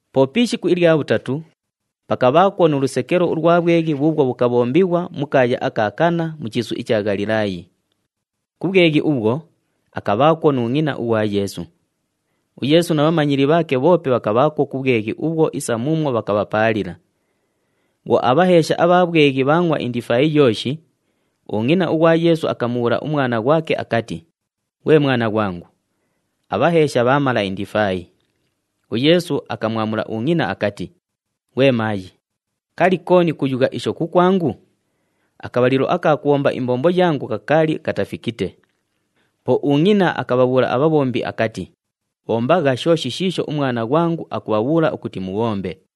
Po pi ishiku ilya bhutatu, pakabhaakwo nu lusekelo ulwa bhweghi bhuubhwo bhukabhombighwa mu kaaya aka Kana, mu chiisu icha Ghalilaayi. Ku bhweghi ubhwo, akabhaakwo nu ngʼina ughwa Yeesu. UYeesu na bhamanyili bhaake bhoope bhakabhaakwo ku bhweghi ubhwo isa muumwo bhakabhapaalila. Bhwo abhaheesha abha bhweghi bhaangʼwa indifaayi yooshi, ungʼina ughwa Yeesu akamubhuula umwana ghwake akati, “Ghwe mwana ghwangu, abhaheesha bhaamala indifaayi.” UYeesu akamwamula ungʼina akati, “Ghwe maayi, kali, kooni kuyugha isho kukwangu? Akabhalilo aka kubhomba imbombo yangu kakaali katafikite.” Po ungʼina akabhabhuula abhabhombi akati, “Bhombagha shooshi shiisho umwana ghwangu akubhabhuula ukuti mubhombe.”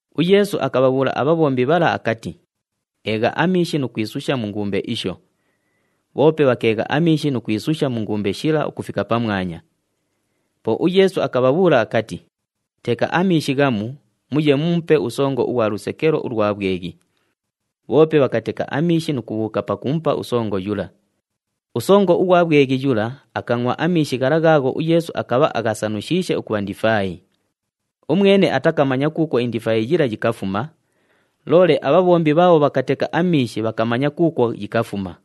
UYeesu akabhabhuula abhabhombi bhala akati, “Eegha amiishi nu kwisusha mu ngumbe isho.” Bhoope bhakeegha amiishi nu kwisusha mu ngumbe shila ukufika pamwanya. Po uYeesu akabhabhuula akati, “Teka amiishi ghamu muye mumupe usongo ughwa lusekelo ulwa bhweghi.” Bhoope bhakateka amiishi nu kubhuuka pakumupa usongo yula. Usongo ughwa bhweghi yula akangʼwa amiishi ghala ghaagho uYeesu akabha aghasanushiishe ukubha ndifaayi. Umwene atakamanya kuukwo indifaayi yila yikafuma, loole abhabhombi bhaabho bhakateka amiishi bhakamanya kuukwo yikafuma.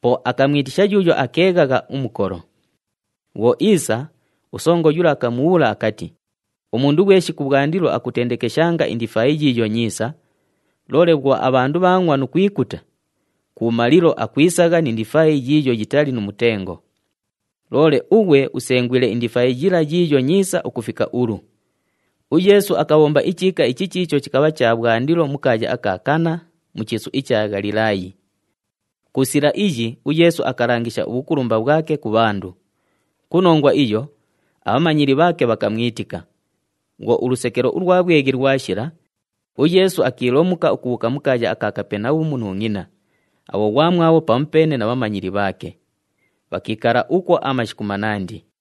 Po akamwitisha yuuyo akeeghagha umukolo. Bhwo iisa, usongo yula akamubhuula akati, “Umundu ghweshi kubhwandilo akutendekeshanga indifaayi yiiyo nyiisa, loole bhwo abhandu bhaangʼwa nu kwikuta, kubhumalilo akwisagha ni ndifaayi yiiyo yitali nu mutengo. Loole ughwe usengwile indifaayi yila yiiyo nyiisa ukufika ulu!” UYeesu akabhomba ichiika ichi chiicho chikabha cha bhwandilo mu kaaya aka Kana, mu chiisu icha Ghalilaayi. Ku sila iyi uYeesu akalangisha ubhukulumba bhwake ku bhandu. Ku nongwa iyo, abhamanyili bhaake bhakamwitika. Bhwo ulusekelo ulwa bhweghi lwashila, uYeesu akiilomuka ukubhuuka ku kaaya aka Kapenabhumu nu ngʼina, abhoghwamwabho pamupeene na bhamanyili bhaake. Bhakiikala ukwo amashiku manandi.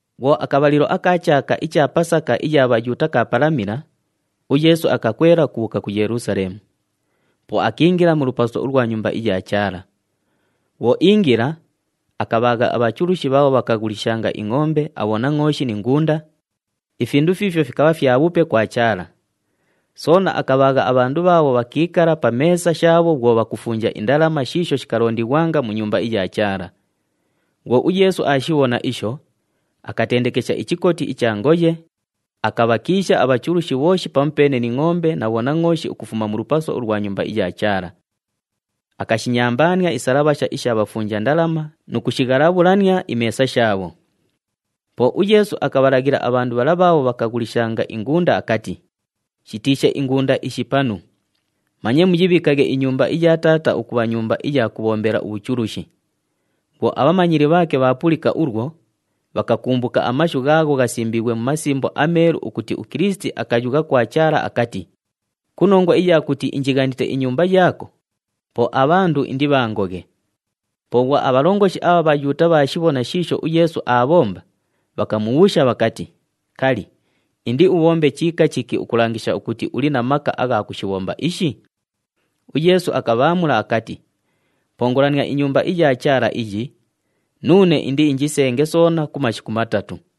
Bhwo akabhalilo aka chaaka icha Pasaka iya Bhayuuta kaapalamila, uYeesu akakwela ukubhuuka ku Yelusaleemu. Po akiingila mu lupaso ulwa Nyumba iya Chaala. Bhwo iingila, akabhaagha abhachulushi bhaabho bhakaghulishanga ingʼombe, abhonangʼooshi ni ngunda, ifindu fiifyo fikabha fyabhupe kwa Chaala. Soona akabhaagha abhandu bhaabho bhakiikala pa meesa shaabho bhwo bhakufunja indalama shiisho shikalondighwanga mu Nyumba iya Chaala. Bhwo uYeesu aashibhona isho, akatendekesha ichikoti icha ngoye, akabhakiisha abhachulushi bhooshi pamupeene ni ngʼombe na bhonangʼooshi ukufuma mu lupaso ulwa Nyumba iya Chaala. Akashinyambaania isalabhasha isha bhafunja ndalama nu kushighalabhulania imeesa shaabho. Po uYeesu akabhalaghila abhandu bhala bhaabho bhakaghulishanga ingunda akati, “Shitiishe ingunda ishi panu. Manye muyibhiikaghe inyumba iya Taata ukubha nyumba iya kubhombela ubhuchulushi.” Bhwo abhamanyili bhaake bhaapulika ulwo, bhakakumbuka amashu ghaagho ghasimbiighwe mu Masimbo aMeelu ukuti uKilisiti akayugha kwa Chaala akati, “Ku nongwa iya kuti injighanite inyumba yaako, po abhandu indibhangoghe.” Po bhwo abhalongoshi abha Bhayuuta bhaashibhona shiisho uYeesu aabhomba, bhakamubhuusha bhakati, “Kali, indiubhombe chiika chiki ukulangisha ukuti uli na maka agha kushibhomba ishi?” UYeesu akabhaamula akati, “Pongolania iNyumba iya Chaala iyi, nuune indiinjisenge soona ku mashiku matatu.”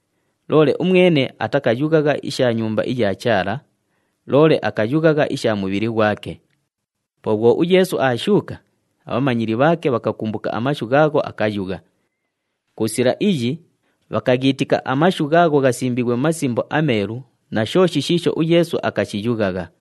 Loole umwene atakayughagha isha Nyumba iya Chaala, loole akayughagha isha mubhili ghwake. Po bhwo uYeesu aashuuka, abhamanyili bhaake bhakakumbuka amashu ghaagho akayugha. Ku sila iyi, bhakaghiitika amashu ghaagho ghasimbiighwe mu Masimbo aMeelu na shooshi shiisho uYeesu akashiyughagha.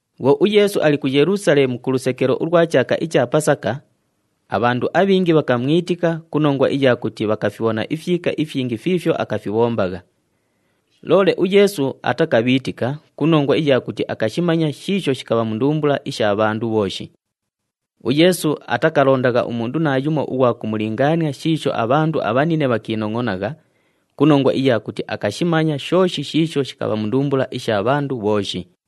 Bhwo uYeesu ali ku Yelusaleemu ku lusekelo ulwa chaaka icha Pasaka, abhandu abhingi bhakamwitika ku nongwa iya kuti bhakafibhona ifyika ifyingi fiifyo akafibhombagha. Loole uYeesu atakabhiitika ku nongwa iya kuti akashimanya shiisho shikabha mu ndumbula isha bhandu bhooshi. UYeesu atakalondagha umundu naayumo ughwa kumulingaania shiisho abhandu abhanine bhakiinongʼonagha ku nongwa iya kuti akashimanya shooshi shiisho shikabha mu ndumbula isha bhandu bhooshi.